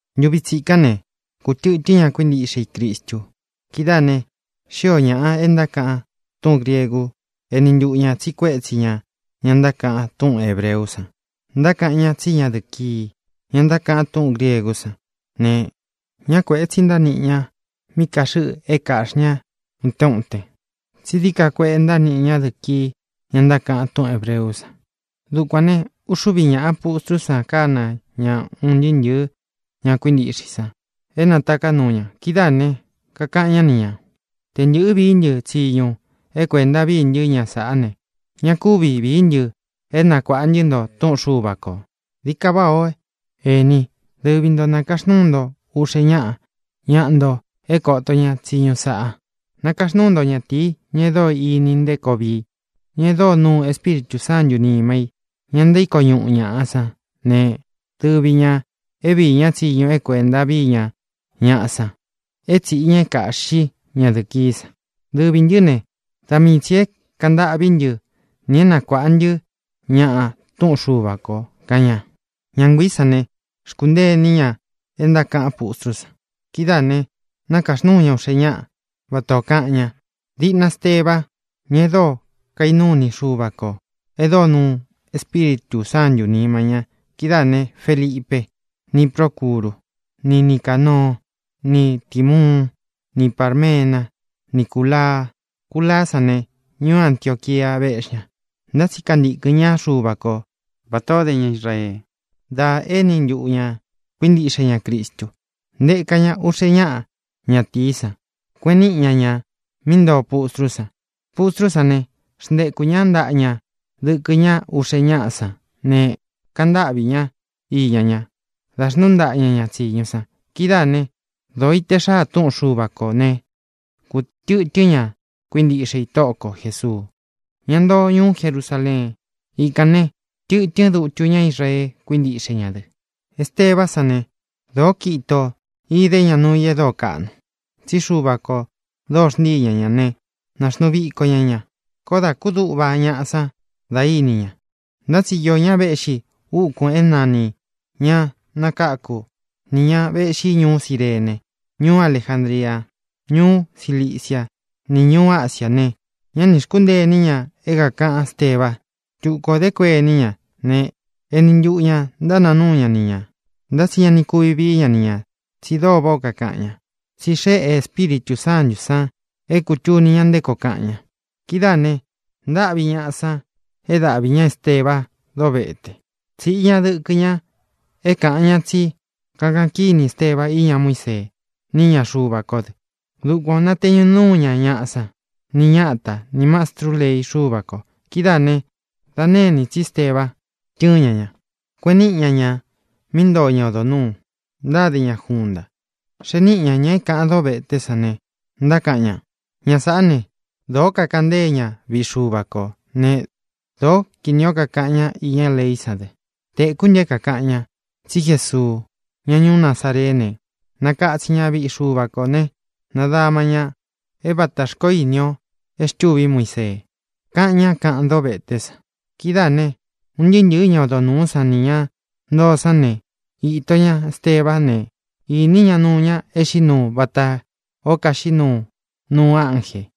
Ntuvi tsikán ne, kūtɨtɨ́n ña kuíntiꞌxe i Cristu. Kidáā ne, xío ñāꞌa e ntákaꞌan túꞌūn griegu éni ntuꞌu ñā tsiꞌi kuétsi ñā ña ntákaꞌan túꞌun hēbreú san, ntákaꞌan ñá tsí ñadɨ̄ꞌɨ kii, ña ntákaꞌan túꞌūn griegú san ne, ñá kuēꞌe tsi ntániꞌi ña mí kāxɨꞌɨ é kāꞌxi ñá utén utén, tsi dií ka kueꞌe ntániꞌi ñadɨ̄ꞌɨ kii, ña ntákaꞌan túꞌun hēbreú san. Dukuān ne, uxúvi ñāꞌa pustrú san kāna ña un ntɨɨ́ ntɨ̄ɨ́ ña kuíntiꞌxe i san é nataká nuu ña. Kidáā ne, kakaꞌan ñá ni ñā: —Tē ntɨꞌɨ́ vií ntɨ tsiñu é kuēnta vií ntɨ ñaꞌa sán ne, ña kúvi vīí ntɨ é nakuāꞌa ntɨ́ nto túꞌun Xuva kō. Dií ka váꞌā ó, ení, dɨvi ntō nakaxnúu nto uꞌxe ñáꞌa ñaꞌa nto é koto ña tsiñu sāꞌa. Nakaxnúu nto ñatīi, ña e dóo ini nté koo vii i, ña e dóo nuu Espíritū Sántū nima i, ña ntaíko ñuꞌu ñaꞌa sán ne, dɨvi ñā é viī ñá tsiñu é kuēnta vii ña ña ñaꞌa san, é tsīꞌi ña é kāꞌxí ñadɨ̄ꞌɨ kií san. Dɨvī ntɨ́ ne, da mii tsī é kāꞌan ntâꞌví ntɨ nī é nakuāꞌa ntɨ́ ñaꞌa túꞌun Xuva kō —kaꞌan ña. Ñá nguiī sán ne, xkúntee iní ña é ntákaꞌan pústrú san. Kidáā né, nākaxnúu ña uꞌxe ñáꞌa, vatā ó kaꞌan ña: diꞌna Esteba, ña e dóo kainuu iní i Xuva kō, e dóo nuu Espíritū Sántū nima ña; kidáā ne, Felipe, ni Prócuru, ni Nicānoo, ni Tīmuún, ni Pārmena, ni Cúlaa. Culaá san ne, ñuú Antioquia véꞌxi ña, ntá tsi kantīkɨn ñá Xuva ko vatā o dé ña Israee dá éni ntuꞌu ñā kuíntiꞌxe ña Cristu. Ntēka ña uꞌxe ñáꞌa ñatīí san, kueꞌen niꞌi ña ña mí ntoo pustrú san. Pustrú san ne, xntekū ñá ntaꞌa ña dɨkɨ ñá uꞌxe ñáꞌa sán ne, kaꞌan ntáꞌvī ñá iña ña da xnuú ntaꞌa ña ña tsīñu san. Kidáā né, dōo ite xáa túꞌun Xuva kō né, kūtɨtɨ́n ña kuíntiꞌxe i Tóꞌo ko Jēsuu, ña ntoo ñuú Jerusaleen. Ikān ne, tɨtɨ́n dutu ñá Israee kuíntiꞌxe ña dɨ. Estebá san ne, dōó kiꞌin itō idé ña nuu i e dóo kaꞌnu, tsí Xuva kō dóo xntíi ña ña ne, nāxnuu viko ña ña. Koó dā kúduꞌva ñaꞌa san da íni ña. Ntá tsi īó ña véꞌxi úkūn é nanī Ña Nakáku, nī ña véꞌxi ñuú Cirene, ñuú Alejandria, ñuú Ciliciá, nī ñuu Ásiā ne, ñá nī xkúntee iní ña é kākaꞌan Ésteba. Tuku ō dé kuení ña ne, eni ntuꞌu ñā ntánāa núu ña ni ñā. Ntá tsi ña ni kuvi vií ña ni ñā, tsi dóo váꞌā ó kakaꞌan ña, tsí xeꞌe Espíritū Sántū san é kūtuni ña nté koo kaꞌan ña. Kidáā ne, ntáꞌvi ña ñaꞌa san é dāꞌví ña Esteba dóvete. Tsīꞌi ña dɨkɨ ña é kāꞌan ña tsí kākaꞌan kíni Esteba iña Muísee ni íña Xuva kó dɨ. Dukuan ō nateñu núu ña ñaꞌa sán, ni ñata, nī mastrú lei Xúva kō. Kidáā né, dā nénī tsi Esteba, tɨ́ɨn ña ña, kueꞌen niꞌi ña ña mí ntoo ñá odo nūu, ntáde ña junta. Xee níꞌi ñā ña é kāꞌan dóveté san ne, ntákaꞌan ña: —Ña sāꞌá ne, dōó kakaꞌan ntée ña viꞌi Xuva kō né, dōó kinī ó kakaꞌan ñá iña leí san dɨ. Tēkú ntɨ é kākaꞌan ña tsí Jesuu, ñá ñuú Nazareé ne, nakatsin ña viꞌi Xuva kō ne, nadama ña é vatā xkoó ini ō e xtûví Muisee —kaꞌan ñá kaꞌan dóveté san. Kidáā ne, un ntɨɨ́ ntɨ̄ɨ́ ña odo nūú san nī ña ntoo sán ne, īto ña Estebá ne, īní ña nuu ña e xiꞌí nuu vatā ó kaxiꞌí nuu nuu ánjē.